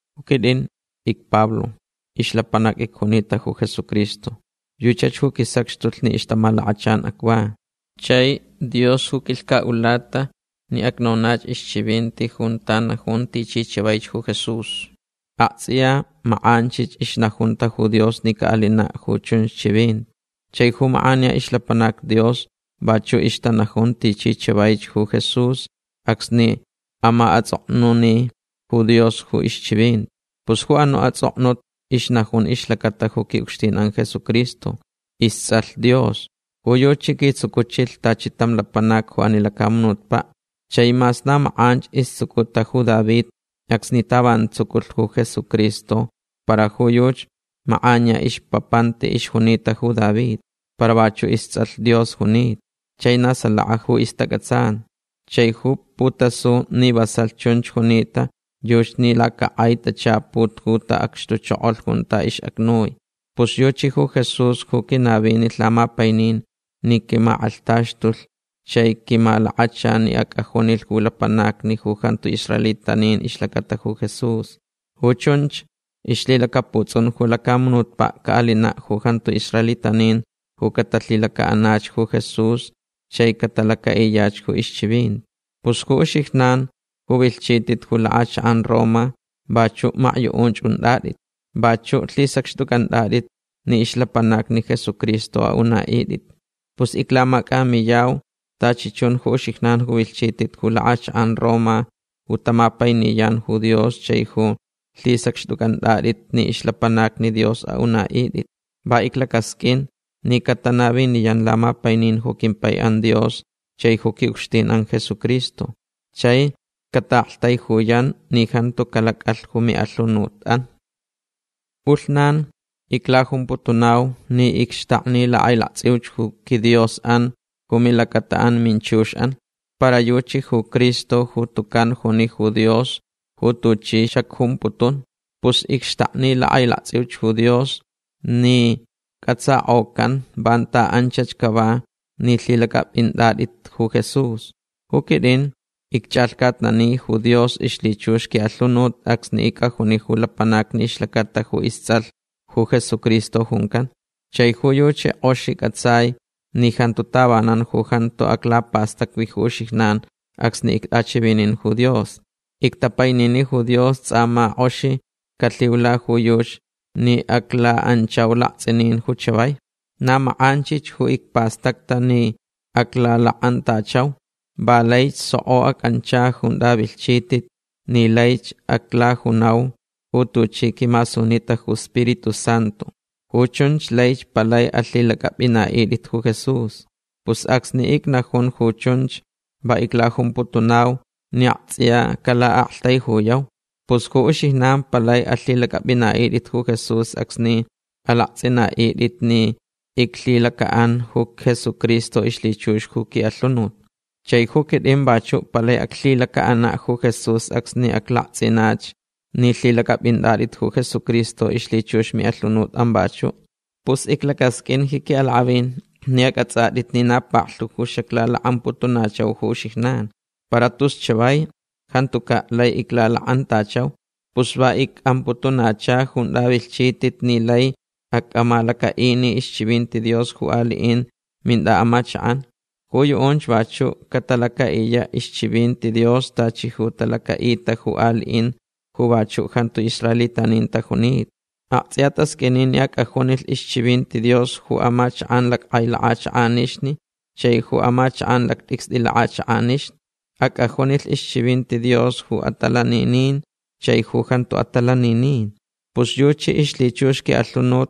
Ju quit'in icPablo. Ixlapanac icjunita ju Jesucristo. Yuchach ju quisacxtulh ni ixtamalakachan acva. Chai Dios ju quilhcalh ni acnonach ixchivinti junta najun tichi chavaich ju Jesús. Akts'iya mak'anchich ixnajunta ju Dios ni ca'alina' ju chunch chivinti. Chai ju mak'aniya ixlapanacni Dios vachu' ixtanajun tichi chavaich ju Jesús acsni ama'ats'oknuni ju Dios ju ixchivinti. Pus ju anu' ats'oknut ixnajun ixlacata ju qui'ucxtin'an Jesucristo. Ists'alh Dios. Ju yuchi quitsucuchilh tachi tam lapanac ju ani lacamunutpa'. Chai mas na mak'anch istsucuta ju David acsni tavanan tsuculh ju Jesucristo para ju yuchi mak'aniya ixpapanti ixjunita ju David. Para vachu' ists'alh Dios junita. Chai na salaka ju istac'atsan. Chai ju putasulh ni vasalh chunch junita yuchi ni lacak'ai tachaput ju ta'acxtuchokolh junta ix'acnui. Pus yuchi ju Jesús ju quinavinilh lamapainin ni quimak'alhtaxtulh chai quimalakachalh ni ac'ajunilh ju lapanacni ju jantu israelitanin ixlacata ju Jesús. Ju chunch ixlhilacaputs'un ju lacamunutpa' ca'alina' ju jantu israelitanin ju catalhilaca'anach ju Jesús chai catalaca'iyach ju ixchivinti. Pus ju uxijnan ju vilhchit'it ju lak'achak'an Roma vachu' makyu'unch unt'at'it. Vachu' lhisacxt'uc'ant'at'it ni ixlapanacnich Jesucristo a'una'it'it. Pus iclamac'amiyau tachi chun ju uxijnan ju vilhchit'it ju lak'achak'an Roma ju tamapainiyan ju Dios chai ju lhisacxt'uc'ant'at'it ni ixlapanacni Dios a'una'it'it. Va iclacasq'uin ni catanaviniyanch lamapainin ju quimpai'an Dios chai ju qui'ucxtin'an Jesucristo. Chai cata'aktaijuyanch ni jantu calac'alh ju mi'alhunut'an. P'ulhnan iclajumputunau ni icxtakni lak'ailakts'iuch ju quiDios'an ju milacata'an minchux'an. Para yuchi ju Cristo ju tucan juni ju Dios ju tuchi xacjumputun. Pus icxtakni lak'ailakts'iuch ju Dios ni c'atsak'ocanch vanta anchach cava ni lhilac'ap'int'at'itch ju Jesús. Ju quit'in icch'alhcatnani ju Dios ixlhichux qui'alhunut acsni ic'ajuni ju lapanacni ixlacata ju ists'alh ju Jesucristo juncan. Chai ju yuchi k'oxich c'atsai ni jantu tavanan ju jantu aclapastacvi ju uxijnan acsni ict'achivininch ju Dios. Ictapainini ju Dios ts'a ma k'oxich calhiula ju yuchi ni acla'anchau lakts'inin ju chavai. Na mak'anchich ju icpastacta ni aclalak'antachauch. Va laich soko ac'ancha junta vilhchit'it ni laich aclajunau ju tuchi quimasunita ju Spiritu Santu. Ju chunch laich palai alhilac'ap'ina'it'it ju Jesús. Pus acsni icnajun ju chunch va iclajumputunau ni akts'iya cala'aktaijuyau. Pus ju uxijnan palai alhilac'ap'ina'it'it ju Jesús acsni alakts'ina'it'it ni iclhilaca'anch ju Jesucristo ixlhichux ju qui'alhunut. Chai ju quit'in vachu' palai aclhilaca'ana' ju Jesús acsni aclakts'inach ni lhilac'ap'inat'it ju Jesucristo ixlhichux mi'alhunut'an vachu'. Pus iclacasq'uin ji qui'alak'avin ni ac'ats'at'it ni na paklhu ju xaclalak'amputunachau ju uxijnan. Para tus chavai jantuca' lai iclalak'antachau. Pus va ic'amputunacha junta vilhchit'it ni lai ac'amalaca'ini ixchivinti Dios ju ali'in mint'a'amachak'an. Ju yu'unch vachu' catalaca'iya' ixchivinti Dios tachi ju talaca'ita ju ali'in ju vachu' jantu israelitanin tajunita. Akts'iya tasq'uini ni ac'ajunilh ixchivinti Dios ju amachak'an lack'ai lak'achak'anixni chaich ju amachak'an lact'icst'i lak'achak'anixni. Ac'ajunilh ixchivinti Dios ju atalanininch chai ju jantu atalaninin. Pus yuchi ixlhichux qui'alhunut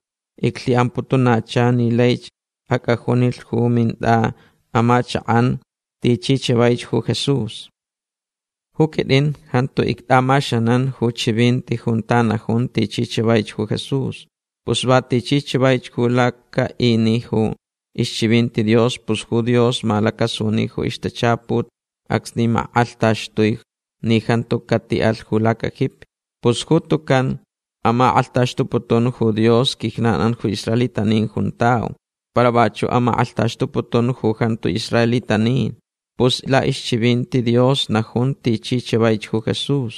iclhi'amputunacha ni laich ac'ajunilh ju mint'a'amachak'an tichi chavaich ju Jesús. Ju quit'in jantu ict'amaxanan ju chivinti junta najun tichi chavaich ju Jesús. Pus va tichi chavaich ju laca'ini ju ixchivinti Dios pus ju Dios malacasuni ju ixtachaput acsni mak'alhtaxtui ni jantu cati'alh ju lacajipi. Pus ju tucan amak'alhtaxtuputun ju Dios quijnan'an ju israelitanin juntau. Para vachu' amak'alhtaxtuputun ju jantu israelitanin. Pus la'ixchivinti Dios najun tichi chavaich ju Jesús.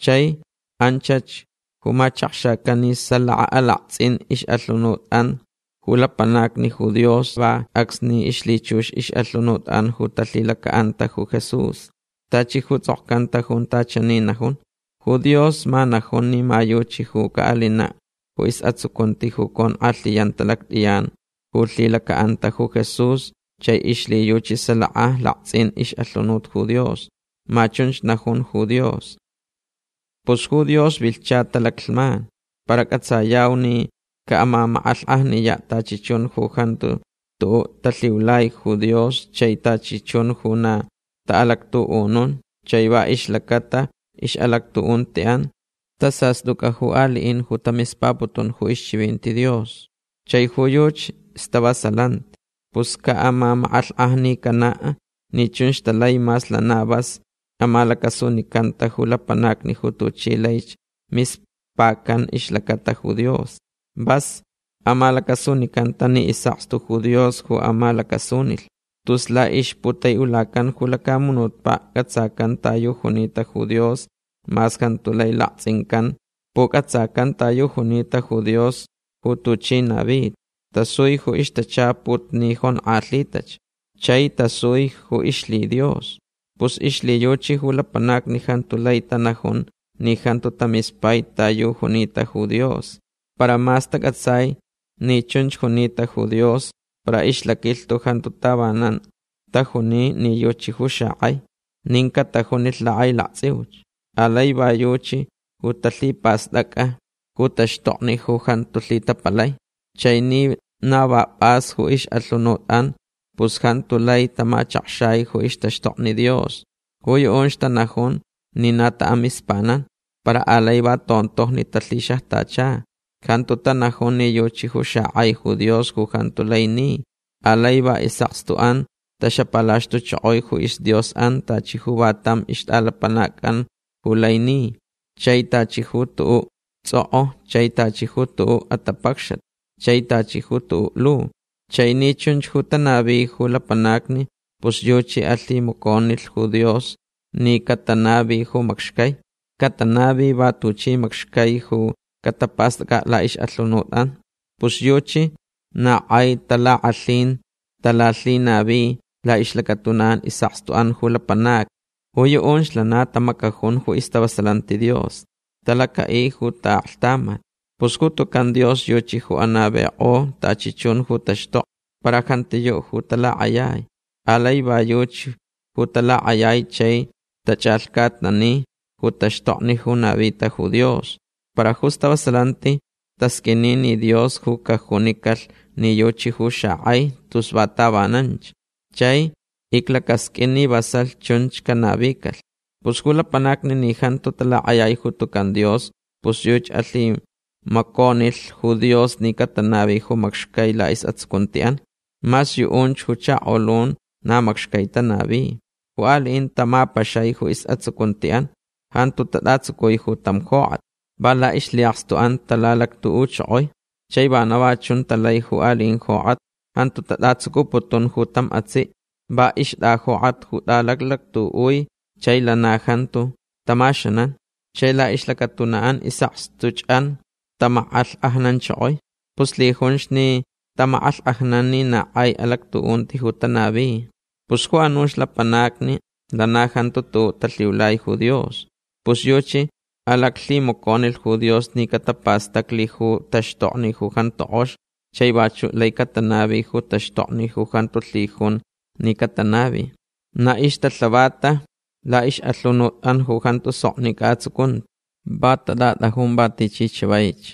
Chai anchach ju machakxacan ni salaka alakts'in ix'alhunut'an ju lapanacni ju Dios va acsni ixlhichux ix'alhunut'an ju talhilaca'anta ju Jesús. Tachi ju ts'okcanta junta chani najun: “Ju Dios ma najun ni ma yuchi ju ca'alina' ju is'atsucunti ju conk'alhiyanta lact'iyan ju lhilaca'anta ju Jesús chai ixlhiyuchi salaka lakts'in ix'alhunut ju Dios”. Ma chunch ju najun ju Dios. Pus ju Dios vilhcha talaclhman para c'atsayau ni ca'amamak'alhk'ajniya' tachi chun ju jantuch tu'u' talhiulai ju Dios chai tachi chun ju na ta'alactu'unun chai va ixlacata ix'alactu'unti'an tasast'uc'a ju ali'in ju tamispaputun ju ixchivinti Dios. Chai ju yuchi stavasalanti. Pus ca'amamak'alhk'ajnicana' ni chunch talai mas lana vas amalacasunicanta ju lapanacni ju tuchi laich mispacan ixlacata ju Dios. Vas amalacasunicanta ni is'akstu ju Dios ju amalacasunilh. Tus la'ixputai'ulacan ju lacamunutpa' c'atsacan ta yu junita ju Dios mas jantu lai lakts'incan. Puc'atsacan ta yu junita ju Dios ju tuchi navita. Tasui ju ixtachaput ni jonk'alhitach. Chai tasuich ju ixlhiDios. Pus ixlhiyuchi ju lapanacni jantu lai tanajun ni jantu tamispai ta yu junita ju Dios. Para mas tac'atsai ni chunch junita ju Dios para ixlaquilhtu jantu tavanan tajuni ni yuchi ju xak'ai. Nin catajunilh lak'ailakts'iuch. Alai va yuchi ju talhipast'ac'a ju taxtokni ju jantu lhitapalai. Chai ni na va p'as ju ix'alhunut'an pus jantu lai tamachakxai ju ixtaxtokni Dios. Ju yu'unch tanajunch ni na ta'amispanan. Para alai va tontojni talhixajtacha. Jantu tanajun ni yuchi ju xak'ai ju Dios ju jantu lai ni. Alai va is'akstu'an taxapalaxtuchokoi ju isdios'an tachi ju va tam ixt'alapanac'an ju lai ni. Chai tachi ju tu'u' ts'ok'o. Chai tachi ju tu'u' atapacxat. Chai tachi ju tu'u' lu. Chai ni chunch ju tanavi ju lapanacni pus yuchi alhimaconilh ju Dios ni catanavilhch ju macxcai. Catanavi va tuchi macxcai ju catapast'ac'a' la'ix'alhunut'an. Pus yuchi na k'ai talak'alhin talalhinavinich la'ixlacatuna'an is'akstu'an ju lapanacni. Ju yu'unch lana tamacajun ju istavasalanti Dios. Talaca'i ju ta'aklhtamat. Pus ju tucan Dios yuchi ju anavik'o tachi chun ju taxtokni. Para jantiyu' ju talak'ayai. Alai va yuchach ju talak'ayai chai tach'alhcatnani ju taxtokni ju navita ju Dios. Para ju stavasalanti tasq'uini ni Dios ju cajunicalh ni yuchi ju xak'ai tus va tavananch. Chai iclacasq'uin ni vasalh chunchach canavicalh. Pus ju lapanacni ni jantu talak'ayai ju tucan Dios pus yuchi alhimaconilh ju Dios ni catanavi ju macxcai la'is'atsucunti'an. Mas yu'unch ju chakolun na macxcai tanavi. Ju ali'in tamapaxai ju is'atsucunti'an. Jantu tat'atsucui ju tam jok'at. Va la'ixlhi'akstu'an talalactu'uchokoi. Chai vana va chunch talai ju ali'in jok'atni. Jantu tat'atsucuputun ju tam atsi'. Va ixt'ajok'at ju t'alalactu'ui chai lana jantu tamaxanan. Chai la'ixlacatuna'an is'akstuch'an tamak'alhk'ajnanchokoi. Pus lhijunch ni tamak'alhk'ajnan ni na k'ai alactu'unti ju tanavi. Pus ju anuch lapanacni lana jantu tu'u' talhiulai ju Dios. Pus yuchi alaclhimaconilh ju Dios ni catapastaclich ju taxtokni ju jantu k'ox chai vachu' laich catanavi ju taxtokni ju jantu lhijun ni catanavi. Na ixtalhavatach la'ix'alhunut'an ju jantu soknic'a atsucunti. Va tat'at'ajun va tichi chavaich.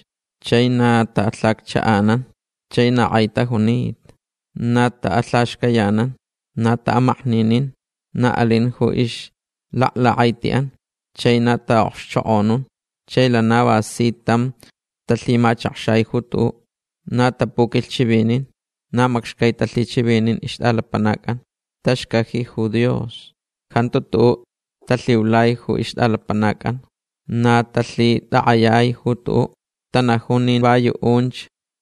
Chai na ta'alhaccha'ananch. Chai na k'ai tajunita. Na ta'alhaxcayanan. Na ta'amakninin. Na alin ju ixlaklak'aiti'an. Chai na ta'a'okxchok'onun. Chai lana va si tam talhimachakxai ju tu'u. Na tapuquilhchivinin. Na macxcai talhichivinin ixt'alapanac'an. Taxcaji ju Dios. Jantu tu'u' talhiulai ju ixt'alapanac'an. Na talhitak'ayai ju tu'u'. Tanajun ni va yu'unch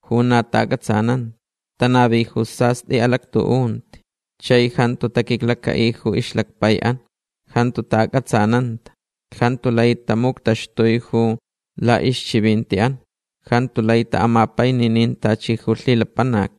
ju na ta'ac'atsananta. Tanavi ju sast'i alactu'unti. Chai jantu taquiclaca'i ju ixlacpai'an. Jantu ta'ac'atsananta. Jantu lai tamuctaxtui ju la'ixchivinti'an. Jantu lai ta'amapaininin tachi ju lhilapanac.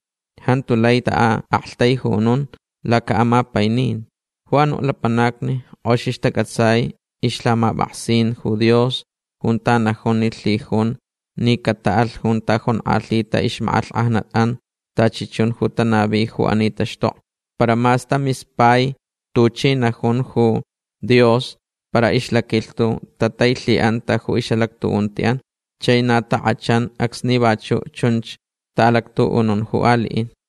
Jantu lai ta'a'aktaijunun laca'amapaininti. Ju anu' lapanacni k'oxich tac'atsai ixlhamap'aksin ju Dios junta najun ni lhijunch ni cata'alh junta jonk'alhita ixmak'alhk'ajnat'an tachi chun ju tanavi ju ani taxtokni. Para mas tamispaich tuchi najunta ju Dios para ixlaquilhtu tatailhi'anta ju ix'alactu'unti'an. Chai na tak'achan acsni vachu' chunch ta'alactu'unun ju ali'in.